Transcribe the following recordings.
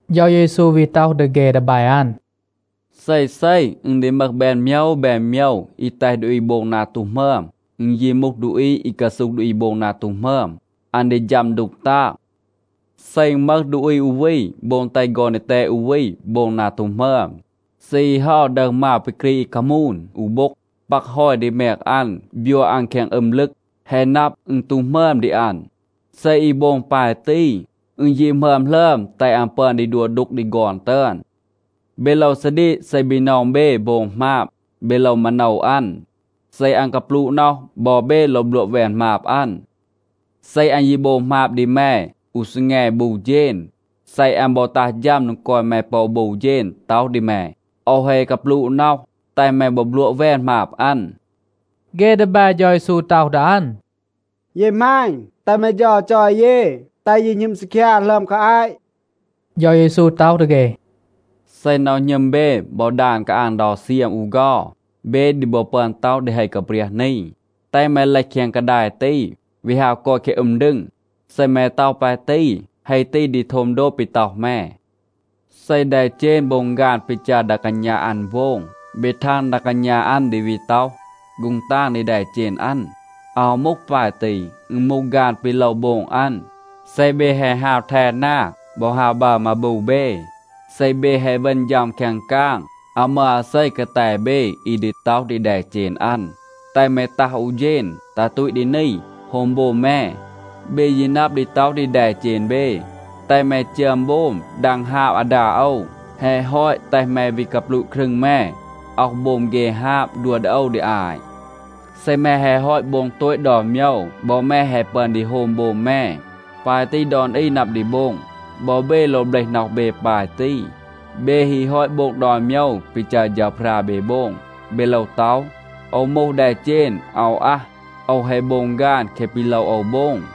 เฌา เยซู วี ต็อห ดี เฆ ดีแบ อัน, “เซเซ อึณ ดี มึห แบน โมยว แบน โมยว, อี แตห ดูอี โบง นา ตู หมึอม. อึณ ยี มูห ดูอี อี กาซูห ดูอี โบง นา ตู หมึอม, อัน ดี ฌัม ดูก ตาง. เซ อึณ มึห ดูอี อู วี, โบง แตห ฆอน ดีแตด อู วี โบง นา ตู หมึอม, เซ อี เฮา ดึห มาว ปี กรีด อี คามูน อู โบ็ง, ปัก ฮอย ดี แมง อัน, บยัว อัน แคง อึม ลึก, แฮะ นับ, อึณ ตู หมึอม ดี อัน. เซ อี โบง ปาย ตี, อึณ ยี หมึอม หลึอม แตห อัน ปึอน ดี ดัว ดูก ดี ฆอน ตึอน. เบ โลว ซาดีก. เซ บีนอง เบ โบง หมาบ, เบ โลว มาโนว อัน. เซ อัน กาปลูะ น็อห, บอ เบ โลว บลัวะ แวน หมาบ อัน. เซ อัน ยี โบง หมาบ ดี แม อู ซีแง บู เฌณ, เซ อัน บอ ตัห ฌัม โดง กอย แม ปอ บู เฌณ ต็อห ดี แม, ‘โอว แฮะ กาปลูะ น็อห,’ แตห แม บอ บลัวะ แวน หมาบ อัน.” เฆ ดีแบ เฌา เยซู ต็อห ดี อัน, “เย หมาณ, แตห แม เฌา จอย เย แตห เย หณึม ซีคยา หลึอม คา อาต.” เฌา เยซู ต็อห ดี เฆ, “เซ น็อห หณึม เบ บอ ดาน กาอาง เดา เซียม อู เฆา, เบ ดี บอ ปึอน ต็อห ดี เฮ กาเปรียห นี, ‘แตห แม เลห แคง กาดาย ตี, วี ฮาว กอย แคง อึม ดึง,’ เซ แม ต็อห ปาย ตี, เฮ ตี ดี โทม โดบ ปี ต็อห แม. เซ แดเจณ โบง ฆาน ปี จัร ดา กาณา อัน โบง, เบ ทาง ดา กาณา อัน ดี วี ต็อห ‘ฆูง ตาง’ ดี แดเจณ อัน? อาว มูห ปาย ตี. อึณ มูห ฆาน ปี โลว โบง อัน. เซ เบ แฮะ ฮาว แท นา บอ ฮาว บัร มาบู เบ, เซ เบ แฮะ เวณ ฌัม แคง กาง, อาว มึห อาเซ กาแต เบ อี ดี ต็อห ดี แดเจณ อัน, ‘แตห แม ตัห อู เฌณ, ตัห ตูต ดี นี, โฮม โบม แม.’ เบ ยี นับ ดี ต็อห ดี แดเจณ เบ, ‘แตห แม จึอม โบม, ดัง ฮาบ อาดา โอว. แฮะ ฮอต, แตห แม วี กาปลูะ ครึง แม, อ็อห โบม เฆ ฮาบ, ดัว ดี โอว ดี อาต. เซ แม แฮะ ฮอต โบง โตต ดอน โมยว, บอ แม แฮะ ปึอน ดี โฮม โบม แม.’ ปาย ตี ดอน อี นับ ดี โบง. บอ เบ โลว เบลห น็อห เบ ปาย ตี. เบ ฮี ฮอต โบง ดอน โมยว ปี จัร เฌาพรา เบ โบง, เบ โลว ต็อห, ‘โอว มูห แดเจณ อาว อัห. โอว แฮะ โบง ฆาน แคะ ปี โลว โอว โบง.’”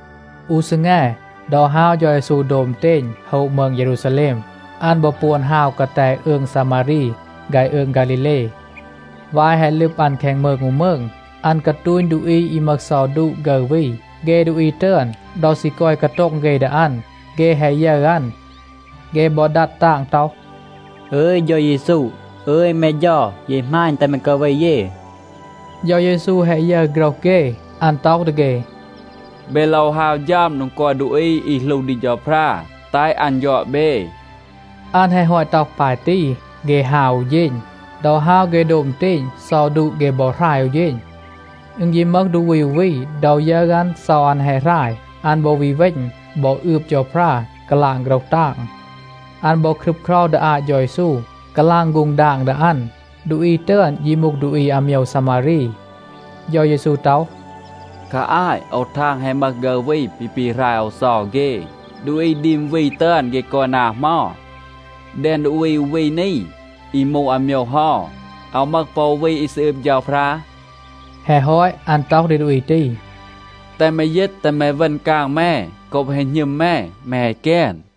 อู ซีแง, ดอ ฮาว เฌา เยซู โดบ อึณเตณ โฮะ มืง เยรูซาแลม, อัน บอ ปวน ฮาว กาแต อืง ซามารี ฆาย อืง ฆาลีเล. วาย แฮะ ลึบ อัน แคง มืง อู มืง, อัน กาตูณ ดูอี อี มึห เซา ดูะa ฆึร วี. เฆ ดูอี ตึอน, ดอ ซี กอย กาโต็ง เฆ ดี อัน, เฆ แฮะ ยึร อัน. เฆ บอ ดัด ตาง ต็อห, “อึย เฌา เยซู, อึย แม เฌา, เย หมาณ, แตห แม กาเว เย.” เฌา เยซู แฮะ ยึร โฆรห เฆ, อัน ต็อห ดี เฆ, “เบ โลว ฮาว ฌัม โดง กอย ดูอี อี หลู ดี เฌาพรา, แตห อัน ยอด เบ,” อัน แฮะ ฮอต ต็อห ปาย ตี, เฆ ฮาว อู เฌณ. ดอ ฮาว เฆ โดบ อึณเตณ, เซา ดูะ เฆ บอ หราย อู เฌณ. อึณ ยี มึห ดูอี อู วี, ดอ ยึร อัน, เซา อัน แฮะ หราย, อัน บอ วี เวณ, บอ อืบ เฌาพรา กาลาง โฆรห ตาง. อัน บอ ครึบเครา ดี อาต เฌา เยซู, กาลาง ฆูง ดาง ดี อัน. ดูอี ตึอน ยี มูห ดูอี อาโมยว ซามารี. เฌา เยซู ต็อห, “คา อาต โอว ทาง แฮะ มึห ฆึร วี ปี ปีหราย โอว เซา เฆ. ดูอี ดีม วี ตึอน, เฆ กอย นา เหมา? แดง ดูอี อู วี นี, อี มูห อาโมยว เฮา อาว มึห ปอ อู วี อี ซี อืบ เฌาพรา?” แฮะ ฮอต, อัน ต็อห ดี ดูอี ตี, “แตห แม ยีต, แตห แม เวณ กาง แม. โกบ แฮะ หณึม แม, แม แฮะ แกน.”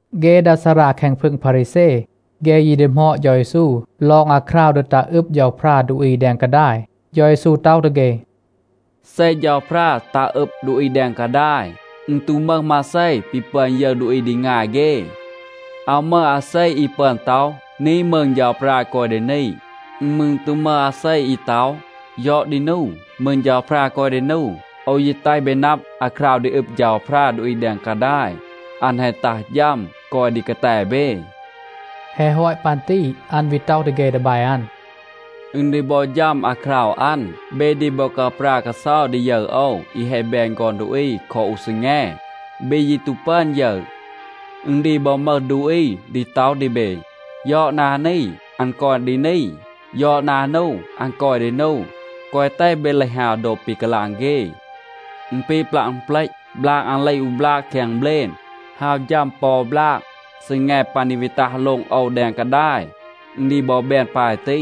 เฆ ดา ซารา แคง พึง พารีแซ, เฆ ยี ดีหมอด เฌา เยซู ลอง อาคราว ดี ตัห อึบ เฌาพรา ดูอี แดง กาดาย. เฌา เยซู ต็อห ดี เฆ, “เซ เฌาพรา ตัห อึบ ดูอี แดง กาดาย, อึณ ตู มึห มาเซ ปี ปึอน ยึร ดูอี ดี งาย เฆ. อาว มึห อาเซ อี ปึอน ต็อห, ‘นี, มืง เฌาพรา กอย ดี นี.’ อึณ มืร ตู มึห อาเซ อี ต็อห ‘ยอด ดี นู, มืง เฌาพรา กอย ดี นู.’ โอว ยี แตห เบ นับ, อาคราว ดี อึบ เฌาพรา ดูอี แดง กาดาย, อัน แฮะ ตัห ฌัม, กอย ดี กาแต เบ.” แฮะ ฮอต ปัน ตี อัน วี ต็อห ดี เฆ ดีแบ อัน, “อึณ ดี บอ ฌัม อาคราว อัน, เบ ดี บอ กาปรา กาเซา ดี ยึร โอว อี แฮะ แบน ฆอน ดูอี คอ อู ซีแง. เบ ยี ตู ปึอน ยึร. อึณ ดี บอ มึห ดูอี ดี ต็อห ดี เบ, ‘ยอด นา นี, อัน กอย ดี นี. ยอด นา นู, อัน กอย ดี นู.’ แกวะ แตห เบ เลห ฮาว โดบ ปี กาลาง เฆ. อึณ ปี ปลัะ อึณเปลต. บลาง อัน เลห อู บลาก แคง เบลณ ฮาว ฌัม ปอ บลาก. ซีแง ปัน ดี วี ตัห โลง โอว แดง กาดาย, อึณ ดี บอ แบน ปาย ตี.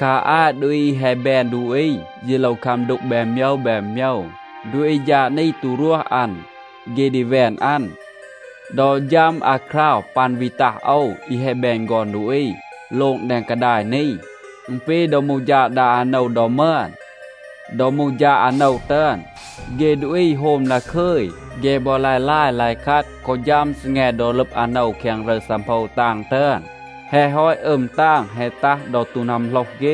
คา อาต ดูอี อี แฮะ แบน ดูอี ยี โลว คัม ดูก แบน โมยว แบน โมยว. ดูอี ฌาด นี ตู รวห อัน, เฆ ดี แวน อัน. ดอ ฌัม อาคราว ปัน วี ตัห โอว อี แฮะ แบน ฆอน ดูอี โลง แดง กาดาย นี, อึณ ปี ดอ มูห ฌาด ดา อาโนว ดอ มึอน. ดอ มูห ฌาด อาโนว ตึอน, เฆ ดูอี โฮม ดาคึย. เฆ บอ ลาย ลาย, ลาย คัด, กอ ฌัม ซีแง ดอ ลึบ อาโนว แคง รึร ซังโพว ตาง ตึอน. แฮะ ฮอต อึม ตาง แฮะ ตัห ดอ ตู นัมโหลห เฆ,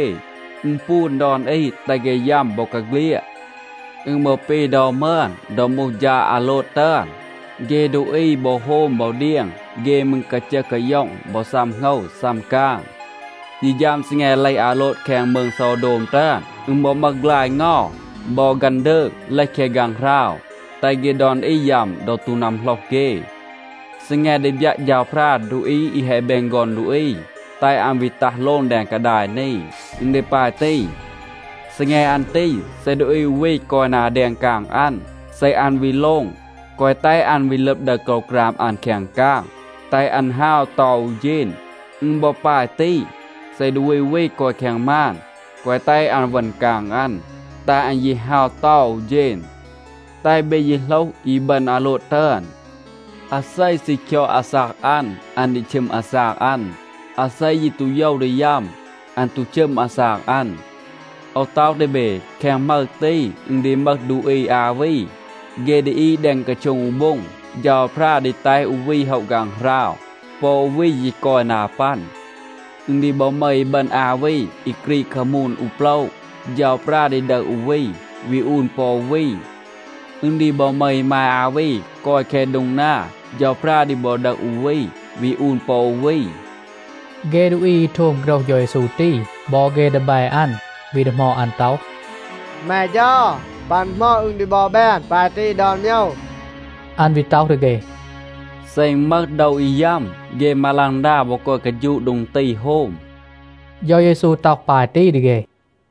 อึณปูน ดอน อี, แตห เฆ ยัม บอกาเฆลียด. อึณ บอ ปี ดอ มึอน, ดอ มูห ฌาด อาโลด ตึอน. เฆ ดูอี บอ โฮม บอ เดียง, เฆ มืร กาจึห กาย็อง, บอ ซัม โหงว, ซัม กาง. ยี ฌัม ซีแง เลห อาโลด แคง มืง โซวโดม ตึอน, อึณ บอ มึห ฆลาย เงา บอ ฆันดืก, เลห แคง ฆางหราว, แตห เฆ ดอน อี ยัม ดอ ตู นัมโหลห เฆ. ซีแง ดี บยัะ เฌาพรา ดูอี อี แฮะ แบน ฆอน ดูอี, แตห อัน วี ตัห โลง แดง กาดาย นี, อึณ ดี ปาย ตี. ซีแง อัน ตี, เซ ดูอี อู วี กอย นา แดง กาง อัน, เซ อัน วี โลง, แกวะ แตห อัน วี ลึบ ดึห โกรวกราม อัน แคง กาง. แตห อัน ฮาว เตา อู เฌณ. อึณ บอ ปาย ตี. เซ ดูอี อู วี กอย แคง มาน, แกวะ แตห อัน เวณ กาง อัน. แตห อัน ยี ฮาว เตา อู เฌณ. แตห เบ ยี โหลห อีบึณ อาโลด ตึอน. อาเซ ซี คยอด อาซาก อัน, อัน ดี ชึม อาซาก อัน. อาเซ ยี ตู โยว ดี ยัม, อัน ตู ชึม อาซาก อัน. โอว ต็อห ดี เบ, แคง หมึร ตี, อึณ ดี มึห ดูอี อา วี, เฆ ดี อีด แดง กาโช็ง อู โบ็ง. เฌาพรา ดี แตห อู วี โฮะ ฆางหราว. ปอ อู วี ยี กอย นา ปัน. อึณ ดี บอ มึห อีบึณ อา วี อี กรีด คามูน อู โปละ. เฌาพรา ดี ดึห อู วี, วี อูน ปอ อู วี. อึณ ดี บอ มึห อีมาย อา วี กอย แคง โดง นา. เฌาพรา ดี บอ ดึห อู วี, วี อูน ปอ อู วี.b” เฆ ดูอี อี โทม โฆรห เฌา เยซู ตี บอ เฆ ดีแบ อัน วี ดีหมอด อัน ต็อห, “แม เฌา, ปัน เหมา อึณ ดี บอ แบน ปาย ตี ดอน โมยว?” อัน วี ต็อห ดี เฆ. “เซ อึณ มึห โดว อี ยัม, เฆ มาลังดา บอ กอย กาฌูะ โดง ตี โฮม.” เฌา เยซู ต็อห ปาย ตี ดี เฆ.